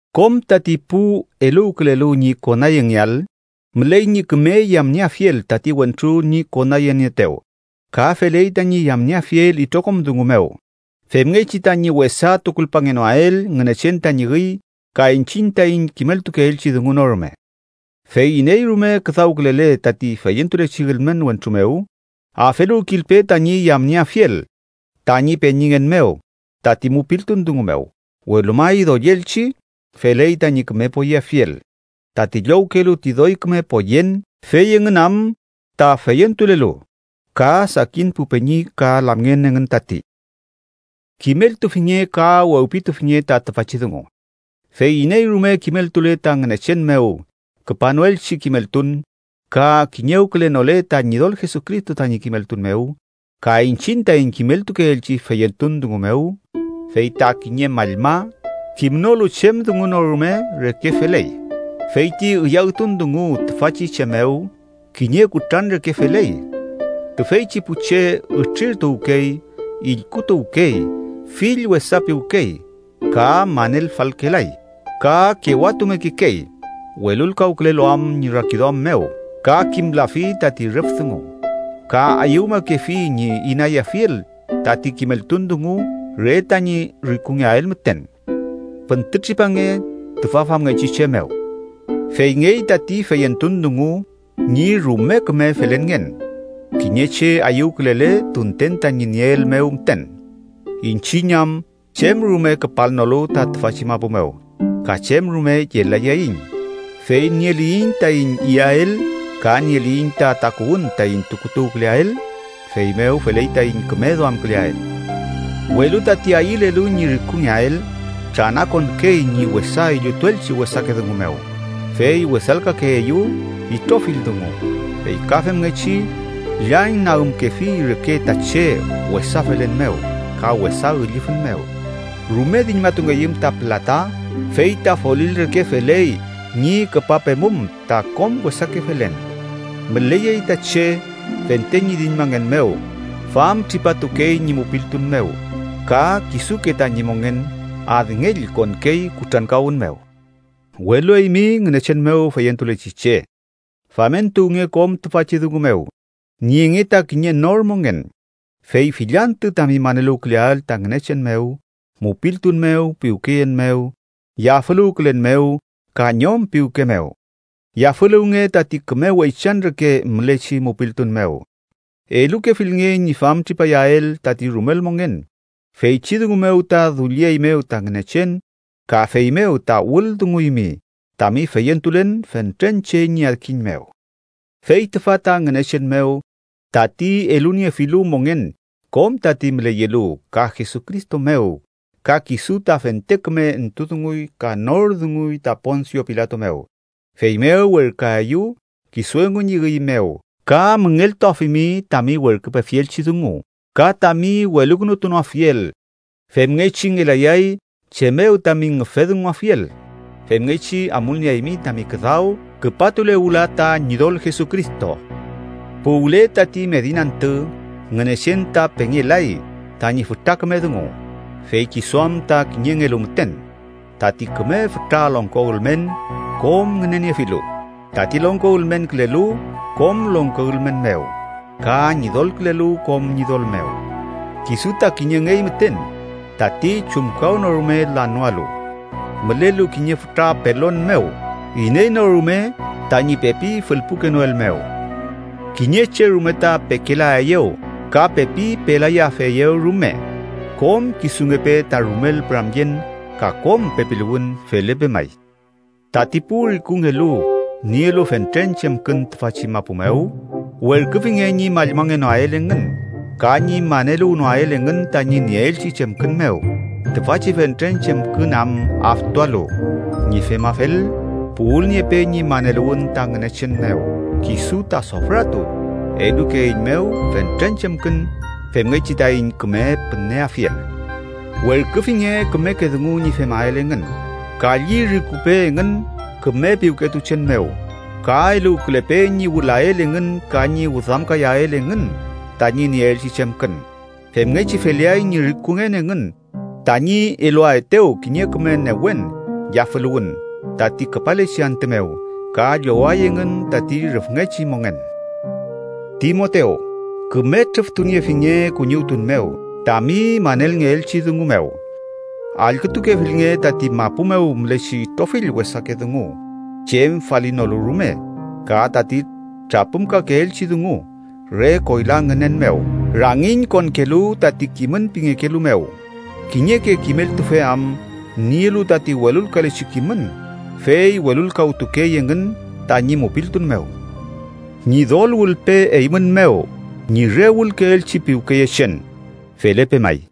Kom tati pu eluwkülelu ñi konayengeael, müley ñi küme yamnieafiel tati wentru ñi konayenieetew ka feley tañi yamnieafiel itrokom dungu mew, femngechi tañi wesa tukulpangenoael Ngünechen tañi üy ka iñchiñ taiñ kimeltukeelchi dungu no rume. Fey iney rume küdawkülele tati feyentulechi ülmen wentru mew, afeluwkilpe tañi yamnieafiel tañi peñingen mew tati mupiltun dungu mew, welu may, doyelchi feley tañi küme poyeafiel, tati llowkelu ti doy küme poyen fey engün am ta feyentulelu ka sakin pu peñi ka lamngen engün tati. Kimeltufinge ka wewpitufinge ta tüfachi dungu: Fey iney rume kimeltule ta Ngünechen mew küpanoelchi kimeltun ka kiñewkülenole ta Ñidol Jesucristo tañi kimeltun mew ka iñchiñ taiñ kimeltukeelchi feyentun dungu mew, fey ta kiñe mallma, kimnolu chem dungu no rume reke feley. Fey ti üyawtun dungu tüfachi che mew kiñe kutran reke feley. Tüfeychi pu che ütrirtuwkey, illkutuwkey, fill wesapiwkey, ka manelfalkelay, ka kewatumekekey welulkawkülelu am ñi rakiduam mew ka kimlafi tati rüf dungu, ka ayüwmakefi ñi inayafiel tati kimeltun dungu re tañi rikungeael müten. Püntütripange tüfa famngechi che mew. Feyngey tati feyentun dungu ñi rume küme felenngen, kiñe che ayüwkülele tunten tañi nieel mew müten, iñchiñ am chem rume küpalnolu ta tüfachi mapu mew, ka chem rume yelayaiñ. Fey nieliyiñ taiñ iyael ka nieliyiñ ta takuwün taiñ tukutuwküleael, feymew feley taiñ küme duamküleael. Welu tati ayülelu ñi rikungeael tranakonkey ñi wesa illutuelchi wesake dungu mew fey wesalkakeeyew itrofill dungu, fey ka femngechi llañnagümkefi reke ta che wesa felen mew ka wesa üllüfün mew. Rume diñmatungeyüm ta pülata fey ta folil reke feley ñi küpapemum ta kom wesake felen. Müleyey ta che, fente ñi diñmangen mew, famtripatukey ñi mupiltun mew ka kisuke tañi mongen adngell konkey kutrankawün mew. Welu eymi, Ngünechen mew feyentulechi che, famentuwnge kom tüfachi dungu mew. Nienge ta kiñe nor mongen, fey fill antü tami maneluwküleael ta Ngünechen mew, mupiltun mew, piwkeyen mew, yafüluwkülen mew, ka ñom piwke mew. Yafüluwnge tati küme weychan reke mülechi mupiltun mew. Elukefilnge ñi famtripayael tati rumel mongen, feychi dungu mew ta dullieymew ta Ngünechen ka feymew ta wüldunguymi tami feyentulen fentren che ñi adkiñ mew. Fey tüfa ta, Ngünechen mew, tati eluniefilu mongen kom tati müleyelu, ka Jesucristo mew, ka kisu ta fente küme entudunguy ka nor dunguy ta Ponsio Pilato mew, feymew werküaeyu kisu engu ñi üy mew ka müngeltuafimi tami werküpefielchi dungu, ka tami welukünutunoafiel, femngechi ngelayay chem mew tami ngüfedunguafiel. Femngechi amulnieaymi tami küdaw küpatule wüla ta Ñidol Jesucristo. Puwle tati medin antü Ngünechen ta pengelay tañi fütra küme dungu, fey kisu am ta kiñengelu müten tati küme fütra longko ülmen kom ngüneniefilu, tati Longko ülmenkülelu kom longko ülmen mew ka Ñidolkülelu kom ñidol mew. Kisu ta kiñengey müten tati chumkawnorume lanoalu, mülelu kiñe fütra pelon mew iney no rume tañi pepi fülpukenoelmew. Kiñe che rume ta pekelaeyew ka pepi pelayafeyew rume. ¡Kom kisungepe ta rumel püramyen ka kom pepiluwün! Felepe may. Tati pu rikungelu nielu fentren chemkün tüfachi mapu mew, werküfinge ñi mallmangenoael engün ka ñi maneluwnoael engün tañi nieelchi chemkün mew, tüfachi fentren chemkün am aftualu. Ñi femafel, puwülniepe ñi maneluwün ta Ngünechen mew, kisu ta sofratu elukeeiñmew fentren chemkün femngechi taiñ küme püneafiel. Werküfinge kümeke dungu ñi femael engün, kalli rikupe engün küme piwketuchen mew ka eluwkülepe ñi wülael engün ka ñi wüdamkayael engün tañi nieelchi chemkün. Femngechi feleay ñi rikungen engün tañi eluaetew kiñe küme newen yafüluwün tati küpalechi antü mew, ka lloway engün tati rüfngechi mongen. Timotew, küme trüftuniefinge kuñiwtun mew tami manelngeelchi dungu mew. Allkütukefilnge tati mapu mew mülechi itrofill wesake dungu chem falinolu rume ka tati trapümkakeelchi dungu re koyla ngünen mew, rangiñ konkelu tati kimün pingekelu mew, kiñeke kimeltufe am nielu tati welulkalechi kimün, fey welulkawtukey engün tañi mupiltun mew. Ñidol wülpe eymün mew ñi re wülkeelchi piwkeyechen. Felepe may.